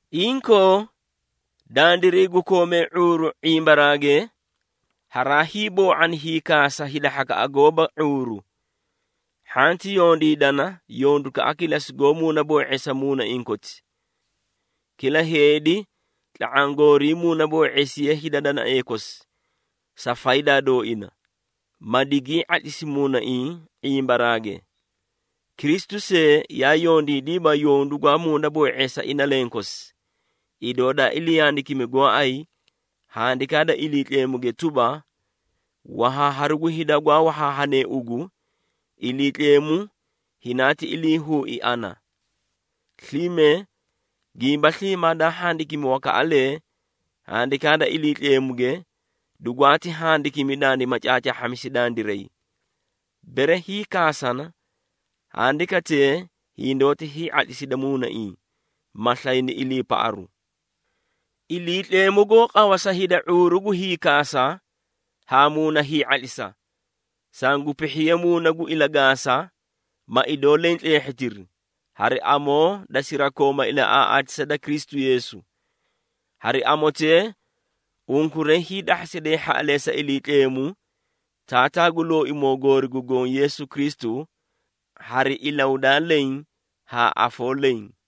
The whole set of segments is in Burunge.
Inkoo, dandiray gu koomee ⁄uuru ⁄imbaraage, haraa hiiboo⁄ani hiikaasa hida hhakaꞌa goóba ⁄uuru. Hhanti yondiidana yondukaꞌa kilesi goó muunaboo⁄eesa muunaiĩ koti. Kila heedi tla⁄aã goorii muunaboo⁄eesiye hida danaee kosi sa faydaa dooina, ma digii ⁄atlisi muunaiĩ ⁄imbaraage. Kristu see yaa yondiidiiba yondu gwaa muunaboo⁄eesa ina lenkosi, idoo daa ilii handikimi gooay Handikaa da Iliitleemuge tuba, “Wahaaharu gu hida gwaa waahaahanee ugu, Iliitleemu, hinaati ilii huui ana.” Slime, gimba sliimaa daa handikimi wakaꞌalee Handikaa da Iliitleemuge, dugwaati handikimi dandima caacaahhamisi dandiray. Bere hiikaasana, handikatee hindoó hii⁄atlisida muunaiĩ, ma slayni iliipaꞌaru. Iliitleemu goó qawa sa hida ⁄uuru gu hiikaasa haa muuna hii⁄atlisa, sangu pihhiye muuna gu ilagaasa, ma idoo leẽ tleehhitiri, hari amoo da sirakooma ilaꞌaaꞌaatisa da Kristu Yeesu. Hari amotee, unkuray hiidahhasiday hhaꞌaleesa Iliitleemu, Taataa gu Looimoo goori gu Goõ Yeesu Kristu, hari ilahudaa leẽ haa afoo leẽ.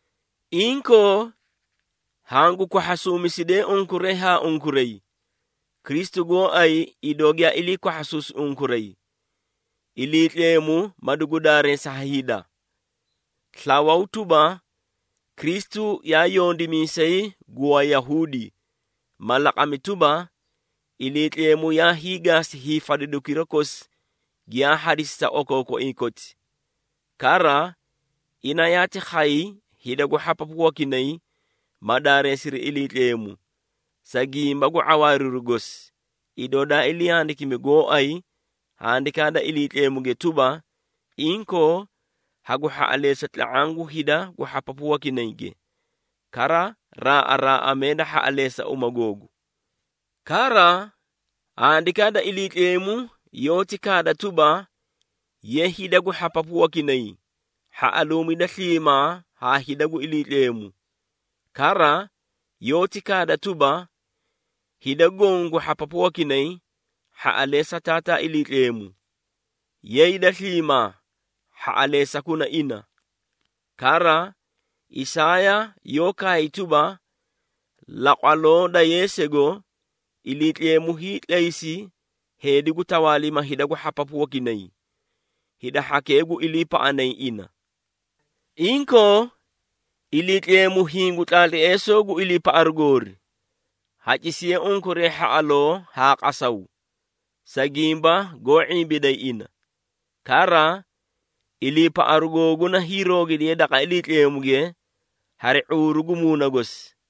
Inkoo, hangu kwahhasuumisidee unkuray haa unkuray, Kristu gooay idoo giyaa ilii kwahhasuusi unkuray, Iliitleemu ma dugu daareesi ha hida. Slawaw tuba, Kristu yaa yondimiisay gu Wayahuudi, ma laqami tuba, Iliitleemu yaa hiigaasi hiifadidukira kosi giyaa hadisi sa okookoiĩ koti. Kara, ina yaati khay hida gu hhapapu wakinay, ma daareesiri Iliitleemu, sa gimba gu ⁄awaariru gosi, idoo daa ilii handikimi gooay Handikaa da Iliitleemuge tuba, “Inkoo, hagu hhaꞌaleesa tla⁄aã gu hida gu hhapapu wakinayge. Kara, raaꞌa raaꞌamee da hhaꞌaleesa uma googu.” Kara, Handikaa da Iliitleemu yoóti kaada tuba, “Ye hida gu hhapapu wakinay, hhaꞌaluumida sliimaa haa hida gu Iliitleemu.” Kara, yoóti kaada tuba, “Hida goõ gu hhapapu wakinay, hhaꞌaleesa Taataa Iliitleemu. Ye hida goõ, daareesakuna ina.” Kara, Isaaya yoó kaay tuba, “Laqwaloo da Yeesego, Iliitleemu hiitlaysi heedi gu tawaalima hida gu hhapapu wakinay. Hida hhakee gu iliipaꞌanay ina.” Inkoo, Iliitleemu hiĩ gu tlaatleesoo gu iliipaꞌaru goori, hacisiye unkuray hhaꞌaloo haa qasaw, sa gimba goó ⁄imbiday ina. Kara, iliipaꞌaru googuna hiiroogidiye daqa Iliitleemuge hari ⁄uuru gu Muuna gosi.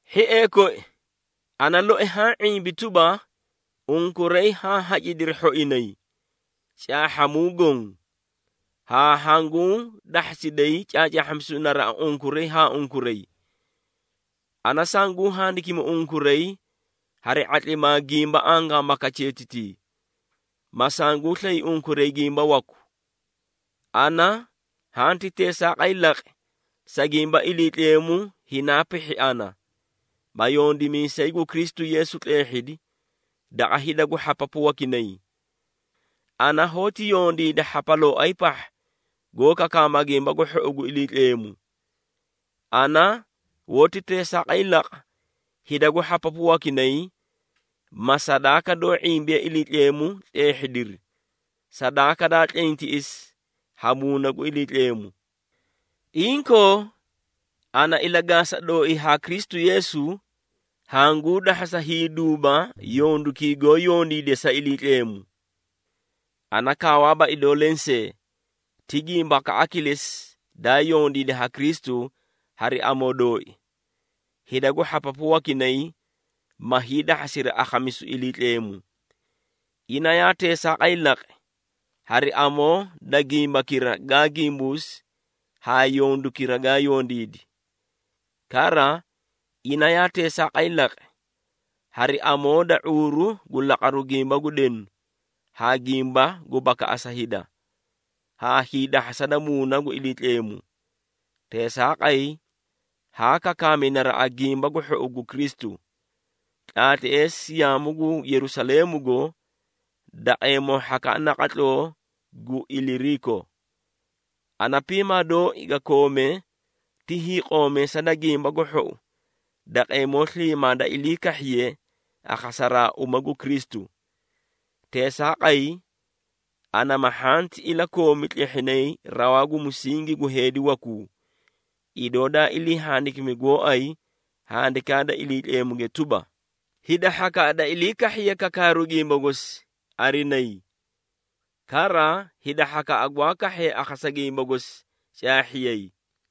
Hhiee koi, ana loi haã ⁄imbi tuba, unkuray haã hacidiri hhoinay, caahhamuu goõ, haa hanguu dahhasiday caacaahhamisu naraꞌa unkuray haa unkuray. Ana sanguu handikimi unkuray hari ⁄atlimaa gimba angaamaka cheetitii, ma sanguu slay unkuray gimba waku. Ana hanti teesaaqay laqi, sa gimba Iliitleemu hinaa pihhi ana, ma yondimiisay gu Kristu Yeesu tleehhidi daqa hida gu hhapapu wakinay. Ana hoóti yondiida hhapalooay pahha goó kakaama Gimba gu Hhou gu Iliitleemu. Ana hoóti teesaaqay laqa, hida gu hhapapu wakinay, ma sadaaka doó ⁄imbiye Iliitleemu tleehhidiri, sadaaka daa tlintiꞌisi ha Muuna gu Iliitleemu. Inkoo, ana ilagaasa dooii haa Kristu Yeesu, hanguu dahhasa hiiduuba yondukii goó yondiide sa Iliitleemu. Ana kaawaaba idoo lensee, ti gimbakaꞌa kilesi daa yondiidi ha Kristu hari amoo dooi, hida gu hhapapu wakinay ma hiidahhasiri akhamisu Iliitleemu. Ina yaa teesaaqay laqi, hari amoo da gimbakira gaa gimbuusi haa yondukira gaa yondiidi. Kara, ina yaa teesaaqay laqi, hari amoo da laqaru gimba gu denu gu bakaꞌasa hida, haa hiidahhasa da Muuna gu Iliitleemu. Teesaaqay, haa kakaami naraꞌa Gimba gu Hhou gu Kristu, tlaatleesi yaamu gu Yerusaleemugo daqeemoo hhakaꞌa naqatloo gu Iliriiko. Ana piimaa dooi ga koome ti hiiqoomeesa da Gimba gu Hhou daqeemoo sliimaa da ilii kahhiye akhasaraa uma gu Kristu. Teesaaqay, ana ma hhanti ilakoomi tlehhinay rawaa gu musingi gu heedi wakuu. Idoo daa ilii handikimi gooay Handikaa da Iliitleemuge tuba, “Hida hhakaꞌa daa ilii kahhiye kakaaru gimba gosi, arinayi. Kara hida hhakaꞌa gwaa kahhee akhasa gimba gosi, caahhiyay.”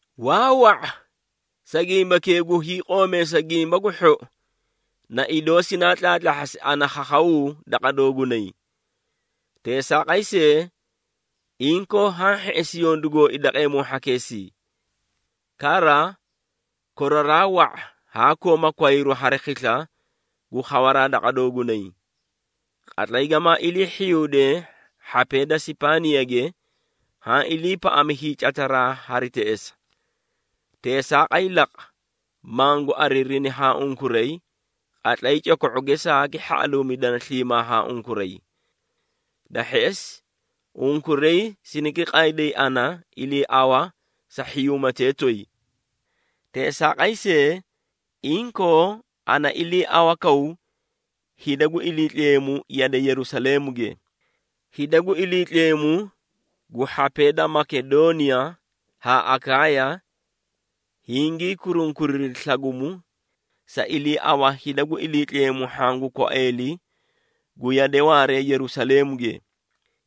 Waa wa⁄a, sa gimbakee gu hiiqoomeesa Gimba gu Hhou na idoo sinaa tlaatlahhasi ana khakhawuu daqa doogunay. Teesaaqay see, inkoo haã hheꞌesi yondu gooi daqeemoo hhakeesii. Kara, koraraa wa⁄a haa kooma kwayru hari khisla gu khawaraa daqa doogunay. Qatlay gamaa ilii hhiyuude hhapee da Sipaaniyage, haã iliipaꞌami hiicataraa hari teꞌesa. Teesaaqay laqa, mangu ariirini haa unkuray, qatlay coko⁄o, gesaa gi hhaꞌaluumidana sliimaa haa unkuray. Da hheꞌesi, unkuray sigini qayday ana iliiawa sa hhiyuumatee toyi. Teesaaqay see, inkoo ana iliiawa kaw hida gu Iliitleemu yade Yerusaleemuge. Hida gu Iliitleemu gu hhapee da Makedooniya haa Akaaya hingii kurunkuriri slagumu sa iliiawa hida gu Iliitleemu hhaã gu kwaeeli gu yade waaree Yerusaleemuge.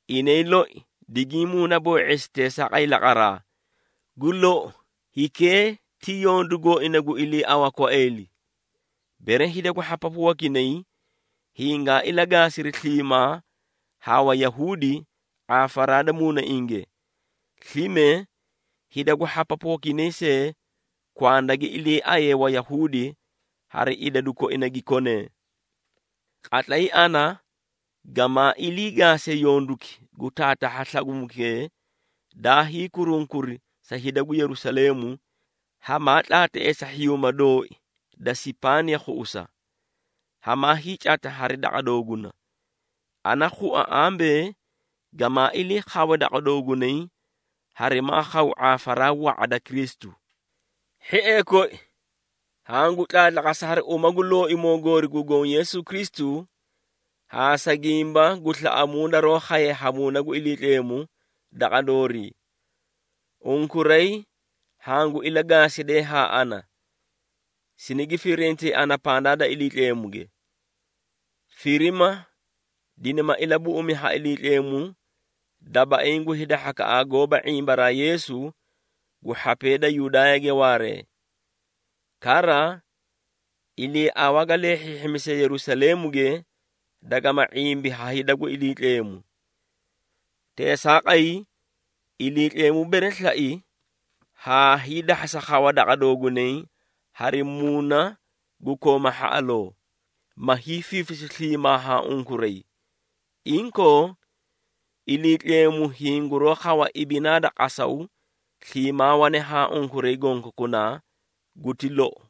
Inay loi digiĩ muunaboo⁄eesi teesaaqay laqaraa, gu lou hikee ti yondu gooina gu iliiawa kwaeeli. Bere hida gu hhapapu wakinay hingaa ilagaasiri sliimaa haa Wayahuudi ⁄aafaraa da muunainge, slime hida gu hhapapu wakinay see kwanda gi iliiaꞌayee Wayahuudi hari idadu koina gi konee. Qatlay ana gamaa iliigaase yonduki gu taatahha slagumukee daa hiikurunkuri sa hida gu Yerusaleemu, hamaa tlaatleesa hhiyuuma dooi da Sipaaniya khuꞌusa, hamaa hiicata hari daqa dooguna. Ana khua ambee, gamaa ilii khawe daqa doogunay, harimaa khaw ⁄aafaraa wa⁄a da Kristu. Hhiee koi, hangu tlaatlaqasa hari uma gu Looimoo goori gu Goõ Yeesu Kristu haa sa gimba gu slaꞌamuu daroó khaye ha Muuna gu Iliitleemu daqa doorii, unkuray hangu ilagaasidee haa ana, sinigi firintay ana pandaa da Iliitleemuge. Firima dinima ilabuꞌumi ha Iliitleemu dabaiĩ gu hida hhakaꞌaa goóba ⁄imbaraa Yeesu gu hhapee da Yudaayage waaree. Kara, iliiawa ga leehhiihimise Yerusaleemuge, dagama ⁄imbi ha hida gu Iliitleemu. Teesaaqay, Iliitleemu bere slai, haa hiidahhasa khawa daqa doogunay hari muuna gu kooma hhaꞌaloo, ma hiifiifisi sliimaa haa unkuray. Inkoo, Iliitleemu hiĩ guroó khawa ibinaa da qasaw, sliimaa wane haa unkuray gonkokunaa. Guti lou.